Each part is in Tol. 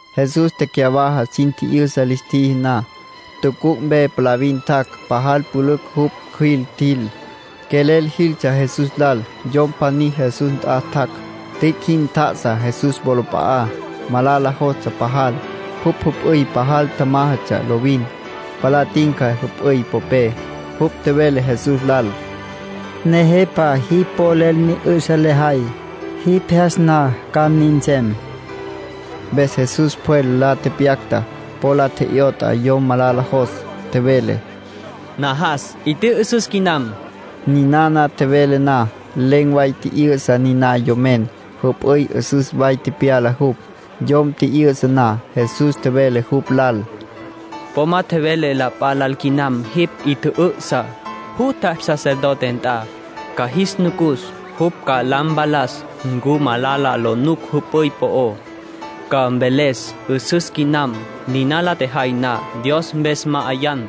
Jesús tecyawaja sin 'yüsa lis tjiji na, tucuc' mpe palavin tjac'. Pajal pülücj jupj cjüil tjil. Quelel jiltsja Jesús lal. Yom pjaní Jesús nt'a tjac'. Tüic' jin tjá'asa Jesús wolap'a'á. Malala jostsja pajal. Jupj jüp'üy pajal tjamájatsja lovin. Palá tinca jüp'üy popé. Jupj tjevele Jesús lal: —Nejepa, jipj polel ni 'ü'sa lejay. Jipj jyas na ca nin nsem. Mpes Jesús pjwel la tepyacta, po la tje'yot'a yom malala jos. Tjevele: —Najas. 'I tjü'ü'süs quinam. Ninana tjevele na, len̈ way tji'yü'sa niná yomen. Jüp'üy 'üsüs way tepyala jupj. Yom tji'yü'sa na, Jesús tjevele jupj lal: —Po ma tjevele la p'a lal quinam jipj 'i tjü'ü'sa. Jutja sacerdote nt'a. Ca jis nucus. Jupj ca la mpalas ncu malala lo nuc p'yüy po'ó. Ca mveles 'üsüs quinam. Niná la tjejay na, Dios mpes ma'ayan,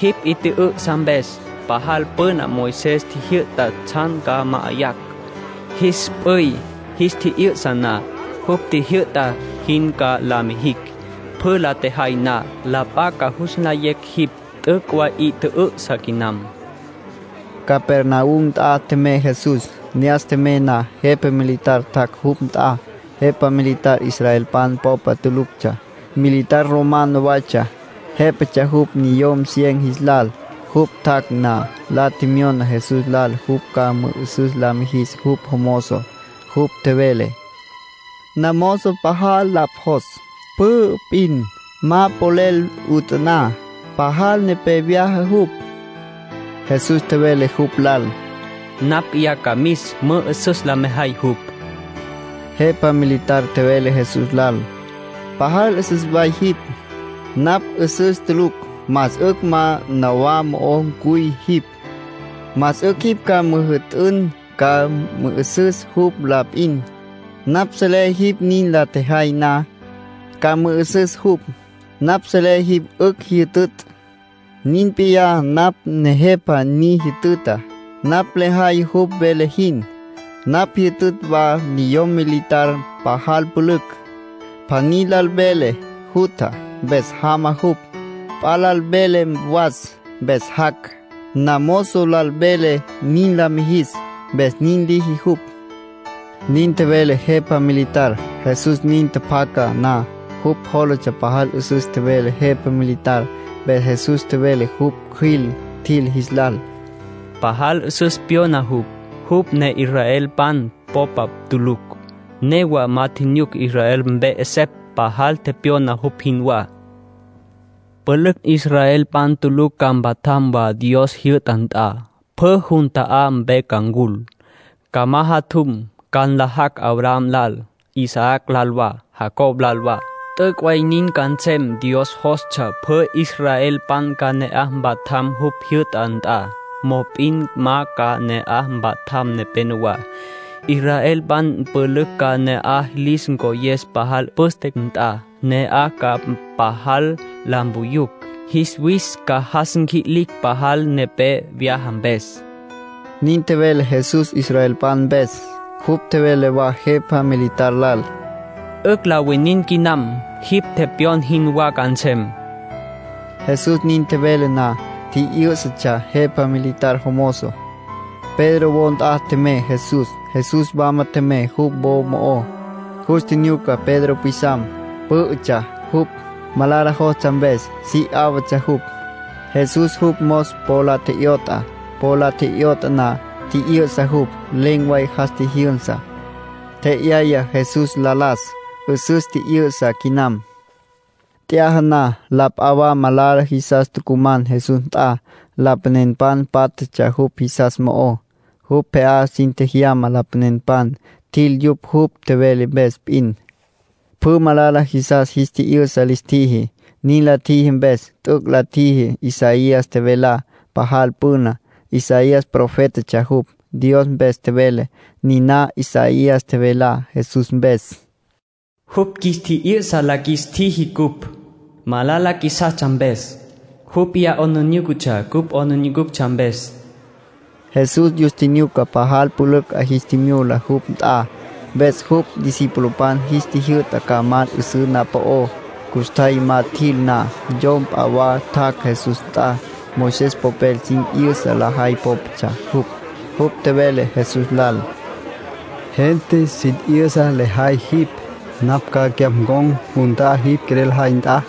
jipj 'i tjü'ü'sa mpes. Pajal püna Moisés tjijyü'ta tsjan ca ma'ayacj, jis p'üy jis tji'yü'sa na. Jupj tjijyü'ta jin ca la mijin. Pjü la tjejay na, la p'a ca jus nlayecj jipj t'üc' way 'i tjü'ü'sa quinam —nin tjevele Jesús. Capernaum nt'a tjemey Jesús. Ne'as tjemey na, jepa militar tjac' jupj nt'a. Jepa militar israelpan popa tuluctsja. Militar romano waytsja. Jépatsja jupj niyom cien jis lal. Jupj tjac' na, la tjemyona Jesús lal jupj ca mü'ü'süs la mijis jupj jomozo. Jupj tjevele: —Namozo pajal lapj jos. Pü'ü p'in, ma polel 'utaná. Pajal nepé vyaja jupj. Jesús tjevele jupj lal: —Napj p'iyá ca mis, mü'ü'süs la mejay jupj. Jepa militar tjevele Jesús lal: —Pajal 'üsüs way jipj. Napj 'üsüs tulucj. Más 'ücj ma nawá mo'o cuy jipj. Más 'ücj jipj ca müjü'tün ca mü'ü'süs jupj la p'in. Napj selé jipj nin la tjejay na, ca mü'ü'süs jupj. Napj selé jipj 'ücj jyütütj. Nin p'iyá napj nejepa ni jütüta. Napj lejay jupj vele jin. Napj jyütütj wa niyom militar pajal pülücj. Pjaní lal velé jutja, mpes jama jupj. P'a lal velé was, mpes jac'. Namozo lal velé nin la mijis, mpes nin liji jupj —nin tjevele jepa militar. Jesús nin tjapjaca na, jupj jólatsja pajal 'üsüs tjevele jepa militar. Mpes Jesús tjevele jupj cjüil tjil jis lal: —Pajal 'üsüs pyona jupj, jupj ne israelpan popa tulucj. Newa ma tjinyuc Israel mpe 'esepj pajal tepyona jupj jinwá. Pülücj israelpan tulucj ca mpatjam wa Dios jyü'ta nt'a. Pjü jun ta'á mpe ca ncul. Ca majatjum, ca nlajacj Abraham lal, Isaac lal wa, Jacob lal wa. T'üc' way nin ca nsem. Dios jostsja pjü israelpan ca ne'aj mpatjam jupj jyü'ta nt'a, mop'in ma ca ne'aj mpatjam nepenowá. Israelpan pülücj ca pje'á lis ncoyes pajal püste nt'a. Ne'aj ca pajal la mpuyucj. Jis wis ca jas nqui'licj pajal nepé vyaja mpes —nin tjevele Jesús israelpan mpes. Jupj tjevele wa jepa militar lal: —'Ücj la winin quinam. Jipj tepyon jinwá ca nsem. Jesús nin tjevele na, tji'yǘ'satsja jepa militar jomozo. Pedro wo nt'a tjemey Jesús. Jesús wama tjemey jupj wo mo'ó, jus tjinyuca Pedro pwisam. Pǘ'ütsja jupj, malala jostsja mpes. Si 'áwatsja jupj. Jesús jupj mos po la tje'yot'a. Po la tje'yot'a na, tji'yü'sa jupj. Len̈ way jas tjijyünsa. Tje'yaya Jesús la las. 'Üsüs tji'yü'sa quinam. T'yaja na, la p'a wa malala jisas tucuman Jesús nt'a. Lapanenpan pátjatsja yupj jisas mo'ó. Jupj pje'á sin tjejyama lapanenpan. Tjil yupj jupj tjevele mpes p'in. Pjü malala jisas jis tji'yü'sa lis tjiji. Nin la tjiji mpes, t'üc' la tjiji Isaías tjevelá pajal püna. Isaías profétatsja jupj. Dios mpes tjevele. Niná Isaías tjevelá Jesús mpes: “Jupj qjuis tji'yü'sa la qjuis tjiji cupj, malala qjuisastsja mpes. Jupj p'iyá 'aplijílatsja cupj 'aplijílatsja mpes.” Jesús yus tjinyuca pajal pülücj 'a jis tjimyula jupj nt'a. Mpes jupj discipulopan jis tjijyü'ta ca mal 'üsǘ na'aj po'ó. Custjay ma tjil na, yom p'a wa tjac' Jesús nt'a. Moisés popel sin 'yüsa lajay pópatsja jupj. Jupj tjevele Jesús lal: —Gente sin 'yüsa lejay jipj. Napj ca cyapj ncon̈ jun ta'á jipj quelel jay nt'a.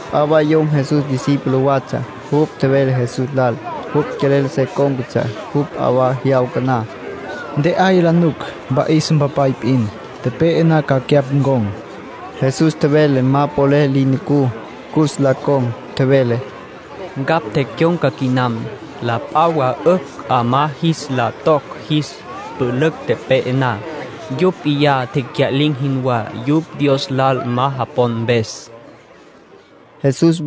P'a wa yom Jesús discípulo watsja. Jupj tjevele Jesús lal jupj quelel se cón̈catsja jupj p'a jyawca na. —Ntje'aya la nuc mpa'is mpapay p'in. Tepe'e na, ca cyapj ncon̈ —tjevele jupj. Jesús tjevele ma polel li nucú cus la con̈. Tjevele: —Ncapj tecyon̈ca quinam. La p'a wa 'ücj 'amá jis la toc jis pülücj tepe'e na. Yupj p'iyá tecya'lin̈ jinwá, yupj Dios lal ma japon mpes —tjevele Jesús.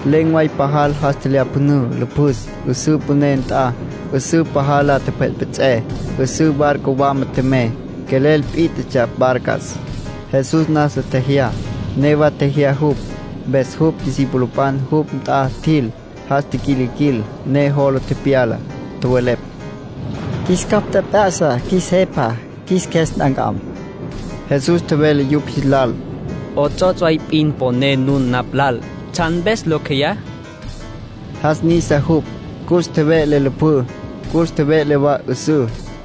Len̈ way pajal jas tjelyapjünǘ lüpjüs 'üsǘ püné nt'a. 'Üsǘ pajal la tjepjetpjets'é. 'Üsǘ barco wama tjemey, quelel pít'atsja barcas. Jesús nasa tjejyá. Newa tjejyatsja jupj. Mpes jupj discipulopan jupj nt'a tjil, jas tiquilquil, ne jola tepyala. Tjowelepj: —Qjuis capj tjep'ya'sa, qjuis Jepa. Qjuis qjues nt'ancam. Jesús tjevele yupj jis lal: —'Ots'ots' way p'in poné nun napj lal. ¿Tsjan mpes locj jeyá? —tjevele. Jas nisa jupj. Cus tjeve'le lüpjǘ, cus tjeve'le wa 'üsǘ.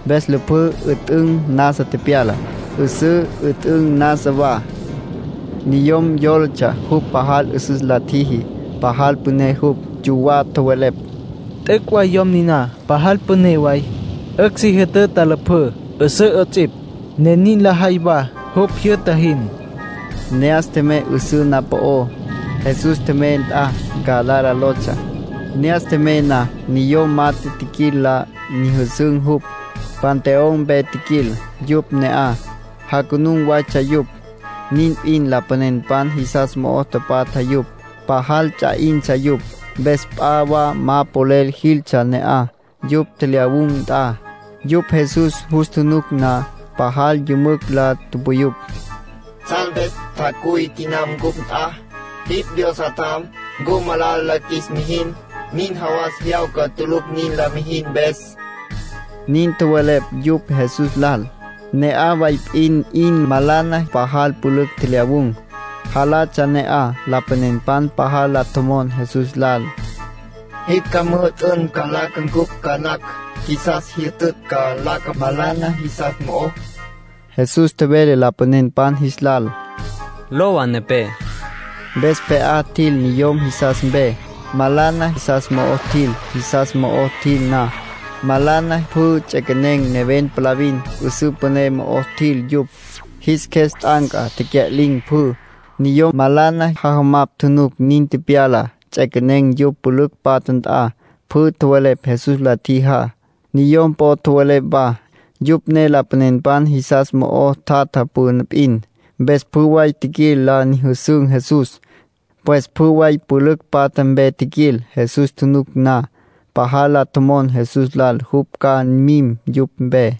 Mpes lüpjǘ 'üt'ün nasa tepyala. 'Üsǘ 'üt'ün nasa wa. Niyom yólatsja jupj pajal 'üsüs la tjiji, pajal püné jupj. Yuwá tjowelepj: “¡T'üc' way yom niná pasal püné way! 'Ücj si jütüta lüpjǘ, 'üsǘ 'ots'ipj, ne nin lajay wa jupj jyü'ta jin.” Ne'as tjemey 'üsǘ na'aj po'ó. Jesús tjemey nt'a Gadara lotsja. Ne'as tjemey na, niyom mat'e tjiquil la nyüjüsün̈ jupj. Panteón mpe tjiquil yupj ne'aj. Janucun waytsja yupj, nin p'in lapanenpan jisas mo'o tapatja yupj. Pajal ts'a 'intsja yupj, mpes la p'a wa ma polel jiltsja ne'aj, yupj tjelyawun̈ nt'a. Yupj Jesús jus tjunuc na, pajal yümücj la tupuyupj: —¿Tsjan mpes tjacuy quinam cupj nt'a? Jipj Dios Jatjam. ¿Ncu ca malala la qjuis mijin? Nin jawas jyawca tulucj nin la mijin mpes —nin tjowelepj yupj Jesús lal. Ne'aj way p'in 'in malana pajal pülücj tjelyawun̈, jalatsja ne'aj. Lapanenpan pajal la tjomon Jesús lal: —Jipj ca müjü'tün ca nlaca ncupj ca nacj. Qjuisas jyütütj ca nlaca malana jisas mo'ó. Jesús tjevele lapanenpan jis lal: —Lowa nepé. Mpes pje'á tjil niyom jisas mpe. Malana jisas mo'o tjil. Jisas mo'o tjil na, malana pjü ts'equenen̈ neven palavin, 'üsǘ püné mo'o tjil yupj. Jis qjues t'anca, tecya'lin̈ pjü. Niyom malana jajamapj tjunuc nin tepyalá, ts'equenen̈ yupj pülücj patja nt'a. Pjü tjowelepj Jesús la tjijá. Niyom po'o tjowelepj wa, yupj ne lapanenpan jisas mo'o tapatja püna p'in. Mpes pjü way tjiquil la nyüjüsün̈ Jesús. Pues pjü way pülücj patja mpe tjiquil. Jus tjunuc na, pajal la tjomon Jesús lal jupj ca mim yupj mpe.